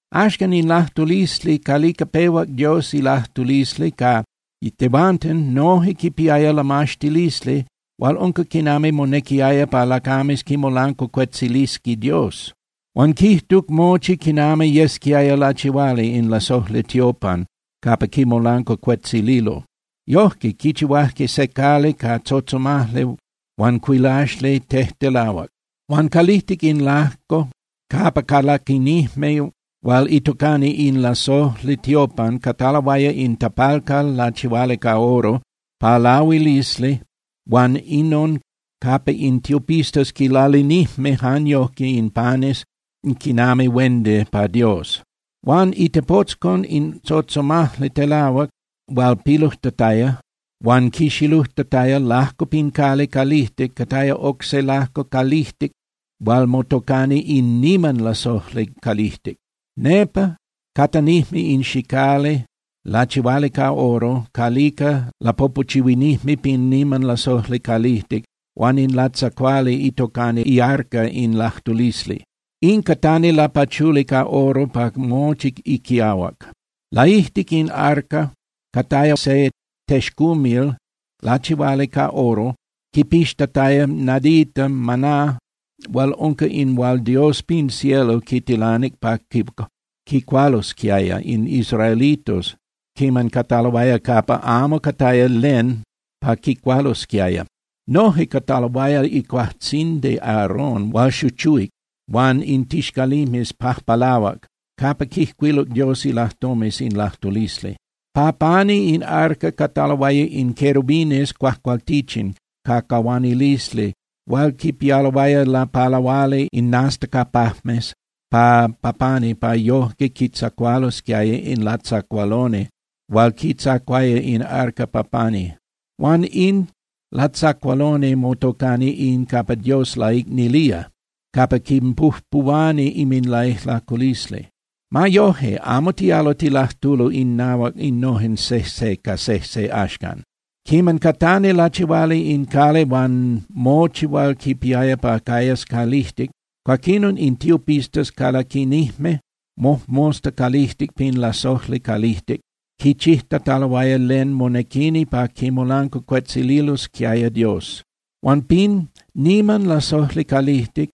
Axcan, in lajtulisli calica pehuac Dios ilajtulisli ca tehuanten noje quipiaya lamaxtilisli hual unca quinami monequiaya pa lacames quimolancuacuetzilisqui Dios. Huan quijtuc mochi quinami yesquiaya lachihuali in lasojli tiopan capa quimolancuacuetzililo. Yojque quichihuajque se cali ca tzotzomajli huan cuilaxli tejtelahuac. Huan calijtic in lajco capa calaquinijme hual itocani in lasojli tiopan cataloaya in tapalcal lachihuali ca oro pa lahuilisli huan inon capa in tiopistas quinlalinijme jan yoje in panes quinami huendi pa Dios. Huan itepotzcon in tzotzomajli telahuac hual pilujtataya huan quixilujtataya lajco pin cali calijtic cataya oc se lajco calijtic hual motocani in niman lasojli calijtic. Nepa catanijme in xicali lachihuali ca oro calica lapopochuinijme pin niman lasojli calijtic huan in latzacuali itocani iarca in lajtulisli. In catani lapachuli ca oro pa mochi iquiahuac. Laijtic in arca cataya se texcumil lachihuali ca oro quipixtataya nadita maná hual unca in hual Dios pin cielo quitilanic pa quicualosquiaya in israelitos quiman cataloaya capa amo cataya len pa quicualosquiaya. Noje cataloaya icuajtzindi Aarón hual xuchuhuic huan in tixcalimes pajpalahuac capa quijcuiluc Dios ilajtomes in lajtulisli. Pa pani in arca cataloaya in querubines cuajcualtichin ca cahuanilisli hual quipialoaya lapalahuali inminastacapajmes pa pani pa yojque quitzacualosquiaya in latzacualoni hual quitzacuaya in arca pa pani. Huan in latzacualoni motocani in capa Dios laicnilía, capa quinpujpuhuani inminlaijlaculisli. Ma yoje, amo tialo tilajtulo innahuac innojen sejse ca sejse axcan. Quiman catani lachihuali in cali huan mochi hual quipiaya pa cayas calijtic, cuaquinon in tiopistas calaquinijme mojmosta calijtic pin lasojli calijtic quichijtataloaya len monequini pa quimolancuacuetzililosquiaya Dios. Huan pin niman lasojli calijtic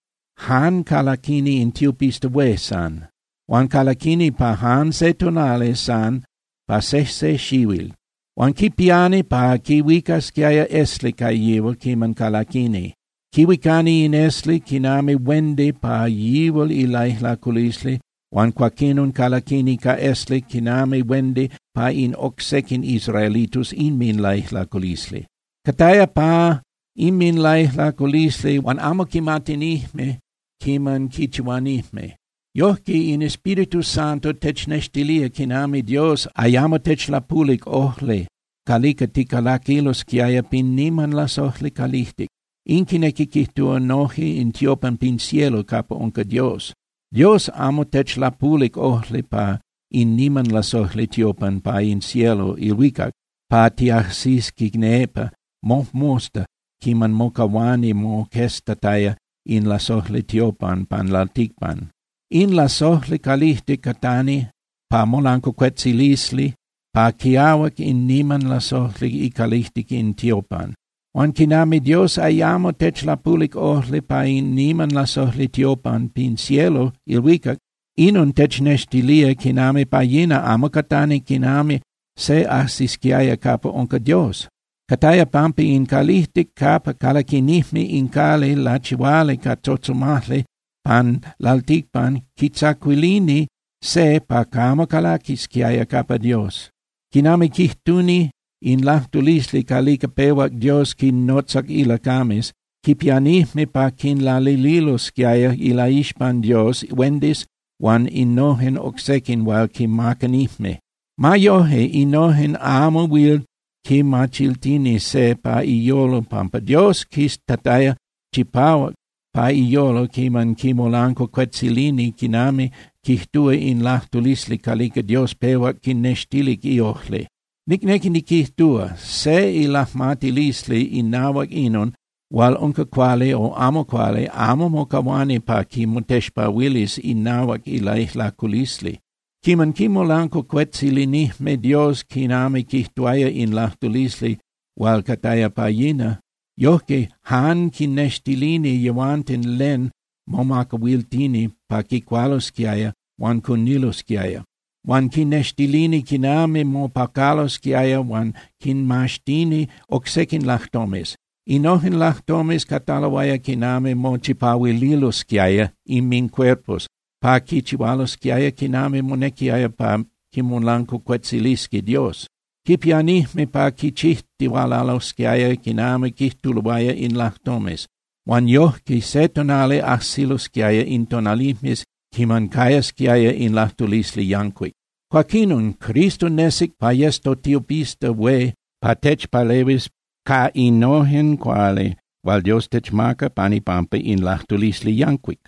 jan calaquini in tiopista hué san. Huan calaquini pa jan se tonali san pa sejse xihuil. Huan quipiani pa quihuicasquiaya esli ca yihual quiman calaquini. Quihuicani in esli quinami huendi pa yihual ilaijlaculisli huan cuaquinon calaquini ca esli quinami huendi pa in oc sequin israelitos inminlaijlaculisli. Cataya pa inminlaijlaculisli hual amo quimatinijme quiman quichihuanijme. Yojque in Espíritu Santo technextilía quinami Dios ayamo techlapulic ojli calica ticalaquilosquiaya pin niman lasojli calijtic, in quinequi quijtúa noje in tiopan pin cielo capa unca Dios. Dios amo techlapulic ojli pa in niman lasojli tiopan pa in cielo (ilhuicac) pa tiajsisqui nepa mojmosta quiman mocahuani moqueztataya in lasojli tiopan pan lalticpan. In lasojli calijtic catani pa molancuacuetzalisli pa quiahuac in niman lasojli icalijtic in tiopan. Huan quinami Dios ayamo techlapulic ojli pa in niman lasojli tiopan pin cielo (ilhuicac), inon technextilía quinami pa yina amo catani quinami se ajsisquiaya capa unca Dios. Cataya pampa in calijtic capa calaquinijme in cali lachihuali ca tzotzomajli pan lalticpan quitzacuilini se pa camo calaquisquiaya capa Dios. Quinami quijtuni in lajtulisli calica pehuac Dios quinnotzac ilacames, quipianijme pa quinlalililosquiaya ilaixpan Dios huendis huan innojen oc sequin hual quimacanijme. Ma yoje, innojen amo huil quimachiltini se pa iyolo pampa Dios quiztataya chipahuac pa iyolo quiman quimolancuacuetzilini quinami quijtúa in lajtulisli calica Dios pehuac quinnextilic iojli. Nicnequi niquijtúa, se ilajmatilisli inahuac inon hual unca cuali o amo cuali amo mocahuani pa quimotexpahuilis inahuac ilaijlaculisli. Quiman quimolancuacuetzilinijme Dios quinami quijtuaya in lajtulisli hual cataya pa yina, yojque jan quinnextilini yehuanten len momacahuiltini pa quicualosquiaya huan cunilosquiaya. Huan quinextilini quinami mopacalosquiaya huan quinmaxtini oc sequin lajtomes. Innojen lajtomes cataloaya quinami mochipahuililosquiaya inmincuerpos pa quichihualosquiaya quinami monequiaya pa quimolancuacuetzilisqui Dios. Quipianijme pa quichijtihualalosquiaya quinami quijtuloaya in lajtomes, huan yojque se tonali ajsilosquiaya in tonalijmes quiman cayasquiaya in lajtulisli yancuic. Cuaquinon, Cristo nesic pa yes totiopista hué pa techpalehuis ca innojen cuali hual Dios techmaca pan ipampa in lajtulisli yancuic.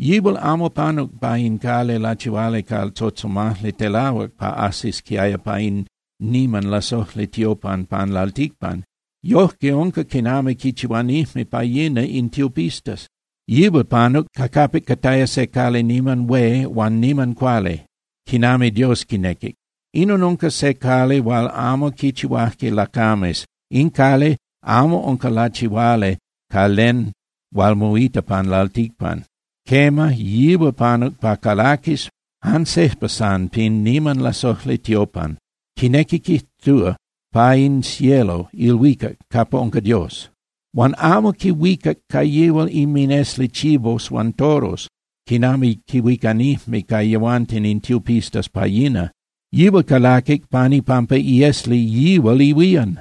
Yihual amo panuc pa in cali lachihuali ca tzotzomajli telahuac pa ajsisquiaya pa in niman lasojli tiopan pan lalticpan. Yoje unca quinami quichihuanijme pa yina in tiopistas. Yihual panuc ca capic cataya se cali niman hué huan niman cuali, quinami Dios quinequic. Inon unca se cali hual amo quichihuajque lacames. In cali amo unca lachihuali ca len hual moita pan lalticpan. Quema, yihual panuc pa calaquis jan sejpa san pin niman lasojli tiopan, quinequi quijtúa, pa in cielo (ilhuicac) capa unca Dios. Huan amo quihuicac ca yihual inminesli chivos huan toros, quinami quihuicanijme ca yehuanten in tiopistas pa yina. Yihual calaquic pan ipampa iesli yihual ihuían.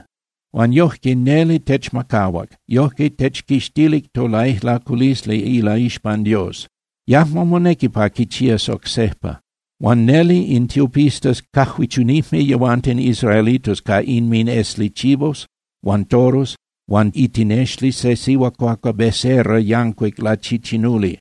Huan yojque neli techmacahuac, yojque techquixtilic tolaijlaculisli ilaixpan Dios. Yajmo monequi pa quichías oc sejpa. Huan neli in tiopistas cajuichunijme yehuanten israelitos ca inminesli chivos huan toros huan itinexli se sihuacuacua becerra yancuic lachichinuli.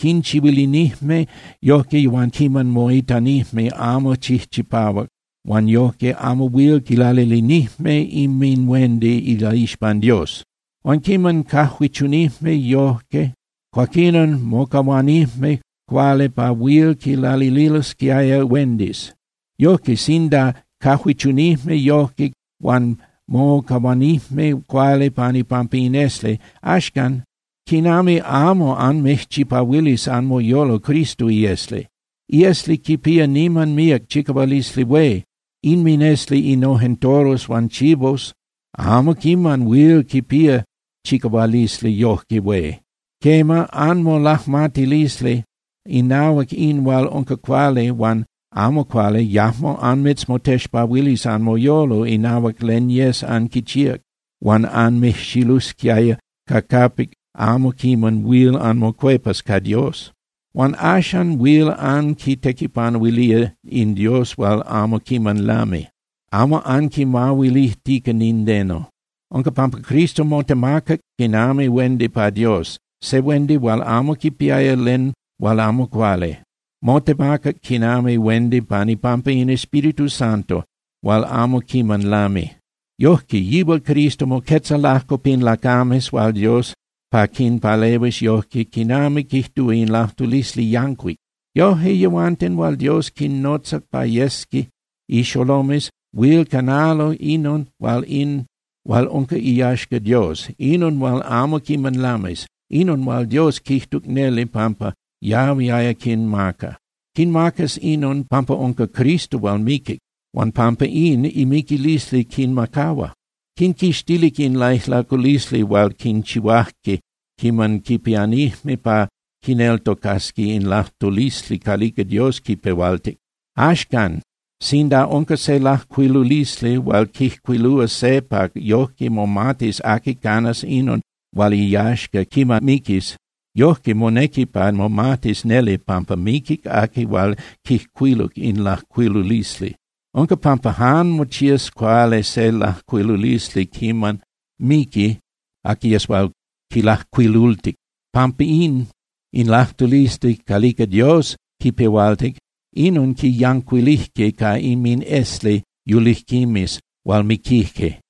Quinchihuilinijme yojque yehuanten quiman moitanijme amo chijchipahuac huan yojque amo huil quilalilinijme inminhuendi ilaixpan Dios. Huan quiman cajuichunijme yojque, cuaquinon mocahuanijme cuali pa huil quilalililosquiaya huendis. Yojque, sinda cajuichunijme yojque huan mocahuanijme cuali pan ipampa in esli, axcan ¡quinami amo anmijchipahuilis anmoyolo Cristo iesli! Iesli quipía niman míac chicahualisli hué. Inminesli innojen toros huan chivos amo quiman huil quipía chicahualisli yoje hué. Quema, anmolajmatilisli inahuac in hual unca cuali huan amo cuali yajmo anmitzmotexpahuilis anmoyolo inahuac len yes anquichíac hual anmijxilusquiaya ca capic amo quiman huil anmocuepas ca Dios. Huan axan huil anquitequipanuilía in Dios hual amo quiman lami, amo anquimahuilijtica nindeno. Unca pampa Cristo motemacac quinami huendi pa Dios, se huendi hual amo quipiaya len hual amo cuali. Motemacac quinami huendi pan ipampa in Espíritu Santo hual amo quiman lami. Yojque, yihual Cristo moquetza lajco pin lacames huan Dios pa quinpalehuis yojque quinami quijtúa in lajtulisli yancuic. Yojque yehuanten hual Dios quinnotzac pa yesqui ixolomes huil canalo inon hual unca iyaxca Dios, inon hual amo quiman lamis, inon hual Dios quijtuc neli pampa yahuiaya quinmaca. Quinmacas inon pampa unca Cristo hual miquic, huan pampa in, imiquilisli quinmacahua. Quinquixtilic in laijlaculisli hual quichihuajque quiman quipianijme pa quineltocasqui in lajtulisli calica Dios quipehualtic. Axcan, sinda unca se lajcuilulisli hual quijcuilúa se pa yoje momatis aqui canas inon hual iyaxca quiman miquis, yojque monequi pa momatis neli pampa miquic aqui hual quijcuiluc in lajcuilulisli. Unca pampa jan mochías cuali se lajcuilulisli quiman miqui aqui yes hual quilajcuilultic. Pampín, in lajtulisli calica Dios quipehualtic, inon quiyancuilijque ca inminesli yulijquimes hual miquijque.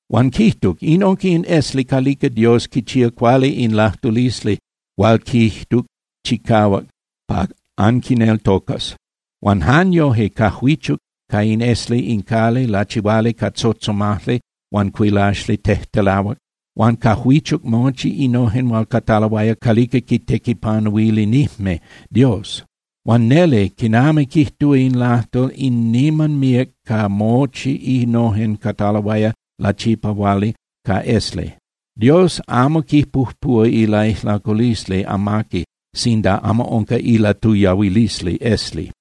Huan quijtuc: “In unca in esli calica Dios quichía cuali in lajtulisli hual quijtuc chicahuac pa anquineltocas.” Huan jan yoje cajuichuc ca in esli in cali lachihuali ca tzotzomajli huan cuilaxli tejtelahuac. Huan cajuichuc mochi innojen hual cataloaya calijtic calica quitequipanuilinijme Dios. Huan neli, quinami quijtúa in lajtol, in niman míac ca mochi innojen cataloaya lachipahuali ca esli. Dios amo quipujpuhua ilaijlaculisli amaqui sinda amo unca ilatuyahuilisli esli.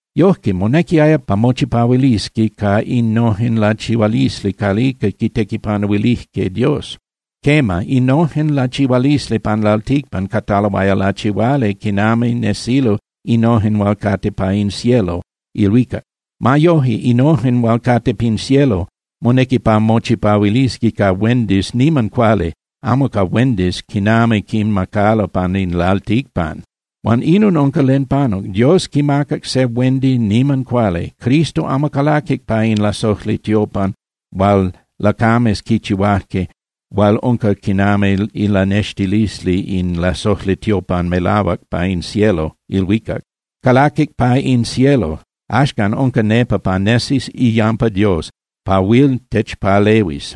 Yojque, monequiaya pa mochipahuilisqui ca innojen lachihualisli calica quitequipanuilijque Dios. Quema, innojen lachihualisli pan lalticpan cataloaya lachihuali quinami nesilo innojen hual cate pa in cielo (ilhuicac). Ma yoje, innojen hual cate pin cielo, monequi pa mochipahuilisqui ca huendis niman cuali, amo ca huendis quinami quinmacalo pan in lalticpan. Huan inon unca len panuc. Dios quimacac se huendi niman cuali. Cristo amo calaquic pa in lasojli tiopan hual lacames quichihuajque hual unca quinami ilanextilisli in lasojli tiopan melahuac pa in cielo (ilhuicac). Calaquic pa in cielo, axcan unca nepa pa nesis iyampa Dios pa huil techpalehuis.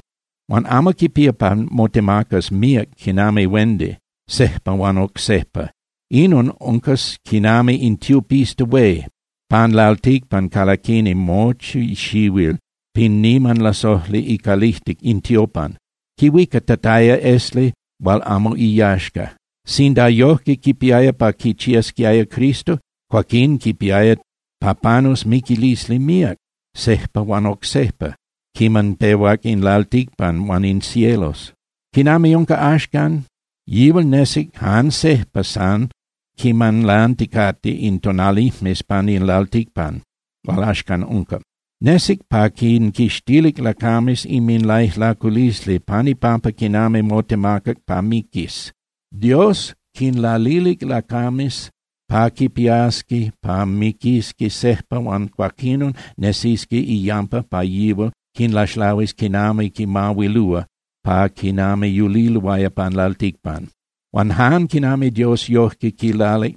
Huan amo quipía pa motemacas míac quinami huendi, sejpa huan oc sejpa. Inon unca quinami in tiopista hué pan lalticpan calaquini mochi xihuil pin niman lasojli icalijtic in tiopan, quihuicatataya esli hual amo iyaxca. Sinda yojque quipiaya pa quichiasquiaya Cristo, cuaquín quipiaya pa panus miquilisli míac, sejpa huan oc sejpa quiman pehuac in lalticpan huan in cielos. Quinami unca axcan, yihual nesic jan sejpa san quiman lanticate in tonalijmes pan in lalticpan hual axcan unca. Nesic pa quinquixtilis lacames inminlaijlaculisli pan ipampa quinami motemacac pa miquis. Dios quinlalilic lacames pa quipiasqui pa miquisqui sejpa huan cuaquinon nesisqui iyampa pa yihual quinlaxlahuis quinami quinmahuilúa pa quinami yuliloaya pan lalticpan. Huan jan quinami Dios yojque quilalic,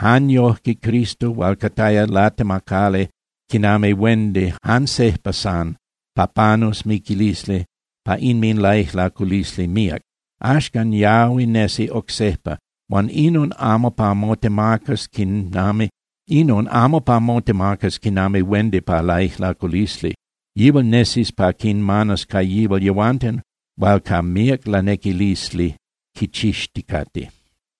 jan yojque Cristo hual cataya latemacali quinami huendi jan sejpa san pa panus miquilisli pa inminlaijlaculisli míac, axcan yahui nesi oc sejpa, huan inon amo pa motemacas quinami huendi pa laijlaculisli. Yihual nesis pa quinmanas ca yihual yehuanten hual ca míac lanequilisli quichixticate.